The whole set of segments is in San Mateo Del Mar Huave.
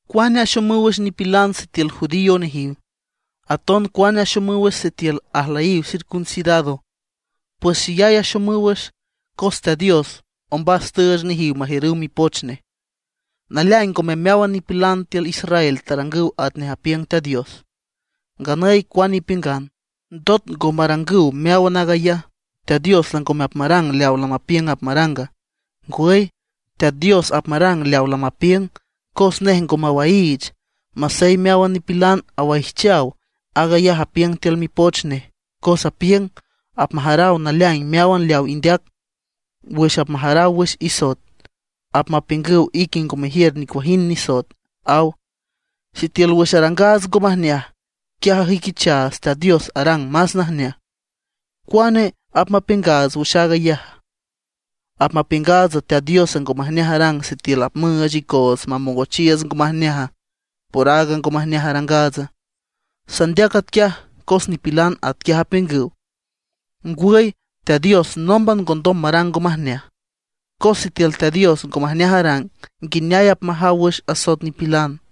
¿Cuane axomüw wüx nipilan sitiül judío nejiw; aton cuane axomüw wüx sitiül ajlüyiw circuncidado? Pues xeyay axomüw wüx, cos Teat Dios ombas tüüch nejiw majiürüw Mipoch nej. Naleaing ngome meáwan nipilan tiül Israel tarangüw atnej apiüng Teat Dios. Nganüy cuane ipiüngan, ¿ndot ngo marangüw meáwan aag ayaj, Teat Dios langome apmarang leaw lamapiüng apmaranga? Ngwüy, Teat Dios apmarang leaw lamapiüng, cos nej ngo mawaiich, masey meáwan nipilan awaijchaw. Aag ayaj apiüng tiül Mipoch nej, cos apiüng: Apmajaraw naleaing meáwan leaw indeac. Wüx apmajaraw wüx isoet, apmapiüngüw ique ngo mejiür nicuajind nisoet, aw. Sitiül wüx arangaats ngo majneaj, quiaj ajüiquichaats Teat Dios arang más najneaj, ¿cuane apmapiüngaats wüx aag ayaja? ¿Apmapiüngaatsa Teat Dios ngo majneaj arang sitiül apmüüch icoots mamongochiiüts ngo majneaja por aaga ngo majneaj arangaats? (Sandeac atquiaj cos nipilan atquiaj apiüngüw.) ¡Ngwüy, Teat Dios nómban ngondom marang ngo majneaj! Cos sitiül Teat Dios ngo majneaj arang, ¿nguineay apmajaw wüx asoet nipilan?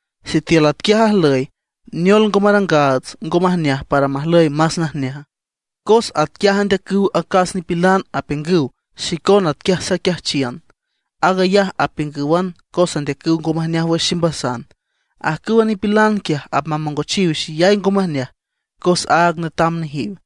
Sitiül atquiaj ajlüy, ¿neol ngo marangaats ngo majneaj para majlüy más najneaja? Cos atquiaj andeacüw acas nipilan apiüngüw xicona atquiaj saquiajchiün. Aag ayaj apiüngǘwan cos andeacüw ngo majneaj wüx ximbasan. Ajcüwa nipilan quiaj apmamongochiw xeyay ngo majneaj cos áag netam nejiw.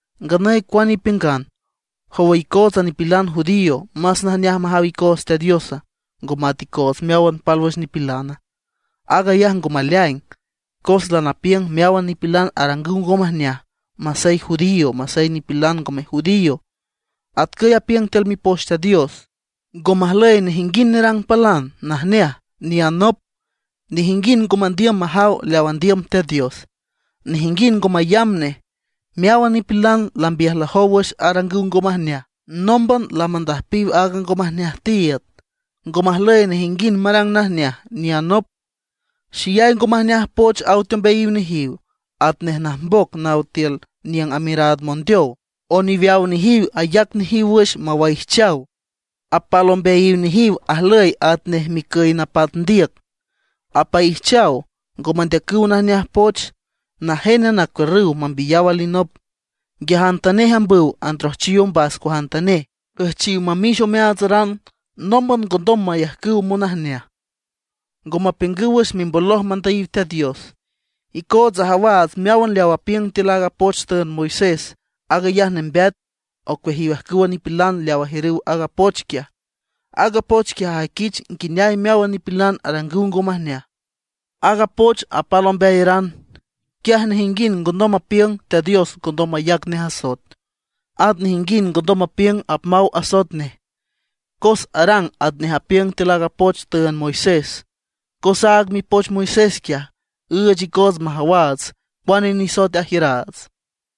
Nganüy cuane ipiüngan, ¿jowa icootsa nipilan judío, más najneaj majaw icoots Teat Diosa, ngo mat icoots meáwan pálwüx nipilana? Aag ayaj ngo maleaing, cos lanapiüng meáwan nipilan arangüw ngo majneaj, masey judíos, masey nipilan ngome judío. Atcüy apiüng tiül Mipoch Teat Dios: Ngo majlüy nejinguind nerang palan najneaj, ngome nop; nejinguind ngo mandiüm majaw leaw andiüm Teat Dios, nejinguind ngo mayamb nej. Meáwan nipilan lambiüjlajow wüx arangüw ngo majneaj; nómban lamandüjpiw aaga ngo majneaj tiiüd. Ngo majlüy nejinguind marang najneaj, ngome nop. Xeyay ngo majneaj poch aw teombeayiw nejiw, atnej najmboc naw tiül niüng amiüraad mondeow. Oniweaw nejiw ayac nejiw wüx mewaijchaw. Apal ombeayiw nejiw ajlüy atnej micüy napat ndiüc; apaijchaw, ngo mandeacüw najneaj poch. Najénan acuiürrüw mambiyaw alinop. Nguiajantanej mambüw androjchiw ombas cuajantanej, üjchiw mamix omeaatsaran. Nómban ngondom mayajcüw monajneaj. Ngo mapiüngüw wüx mimboloj mandüyiw Teat Dios. Icootsa ajawaats meáwan leaw apiüng tiül aaga poch tüünd Moisés, aag ayaj nembeat ocueajiw ajcüwa nipilan leaw ajiürüw aaga poch quiaj. Aaga poch quiaj ajüiquich nguineay meáwan nipilan arangüw ngo majneaj. Aaga poch apal ombeayaran, quiaj nejinguind ngondom mapiüng Teat Dios ngondom mayac nej asoet. At nejinguind ngondom mapiüng apmaw asoet nej, cos arang atnej apiüng tiül aaga poch tüünd Moisés. Cos aaga mipoch Moisés quiaj, üüch icoots majawaats cuane nisoet ajiüraats.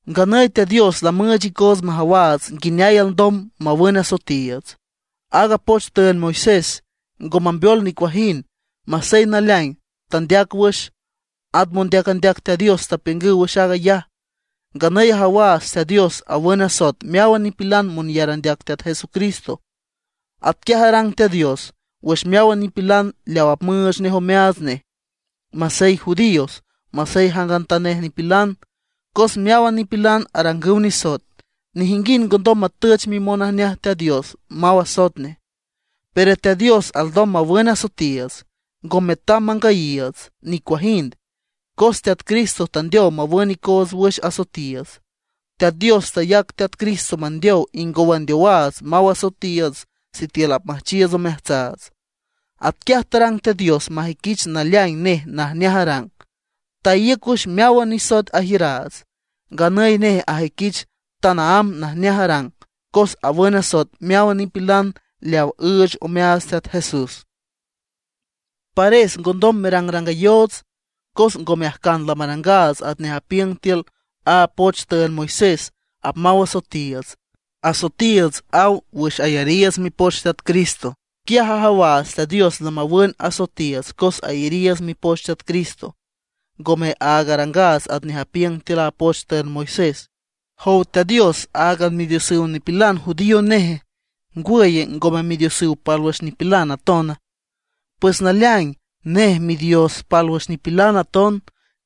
Nganüy Teat Dios lamüüch icoots majawaats nguineay alndom mawün asoetiiüts. Aaga poch tüünd Moisés ngo mambeol nicuajind, masey naleaing tandeac wüx. At mondeac andeac Teat Dios tapiüngüw wüx aag ayaj. Nganüy ajawaats Teat Dios awün asoet meáwan nipilan monyar andeac Teat Jesucristo. Atquiaj arang Teat Dios wüx meáwan nipilan leaw apmüüch nej omeaats nej, masey judíos, masey jangantanej nipilan. Cos meáwan nipilan arangüw nisoet, nejinguind ngondom matüch mimonajneaj Teat Dios maw asoet nej. Pero Teat Dios alndom mawün asoetiiüts, ngo metam mangüyiiüts nicuajind, cos Teat Cristo tandeow mawün icoots wüx asoetiiüts. Teat Dios tayac Teat Cristo mandeow ingow andeowaats maw asoetiiüts sitiül apmüjchiiüts omeajtsaats. Atquiaj tarang Teat Dios majüiquich naleaing nej najneaj arang; taíüc wüx meáwan nisoet tajiüraats. Nganüy nej ajüiquich tanaámb najneaj arang cos awün asoet meáwan nipilan leaw üüch omeaats Teat Jesús. Pares ngondom merangrangayoots, cos ngome ajcan lamarangaats atnej apiüng tiül a poch tüünd Moisés apmaw asoetiiüts; asoetiiüts aw wüx ayariiüts mipoch Teat Cristo. Quiaj ajawaats Teat Dios lamawün asoetiiüts cos ayariiüts mipoch Teat Cristo, ngome aag arangaats atnej apiüng tiül a poch tüünd Moisés. ¿Jow Teat Dios, áagan Midiosan nipilan judío neje? ¿Ngwüye, ngome Midiosüw pálwüx nipilan atona? Pues naleaing, nej Midios pálwüx nipilan aton.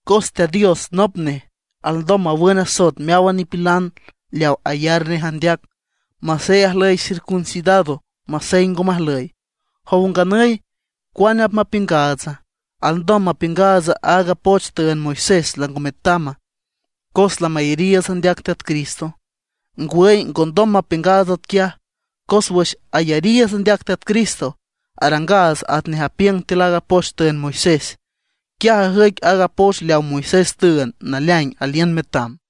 Cos Teat Dios nop nej, alndom mawün asoet meáwan nipilan leaw ayar nej andeac, masey ajlüy circuncidado, masey ngo majlüy. ¿Jow nganüy, cuane apmapiüngaatsa? ¿Alndom mapiüngaatsa aaga poch tüünd Moisés lango metama, cos lamayariiüts andeac Teat Cristo? ¡Ngwüy ngondom mapiüngaats atquiaj! Cos wüx ayariiüts andeac Teat Cristo, arangaats atnej apiüng tiül aaga poch tüünd Moisés. Quiaj ajüic aaga poch leaw Moisés tüünd naleaing aliün metam.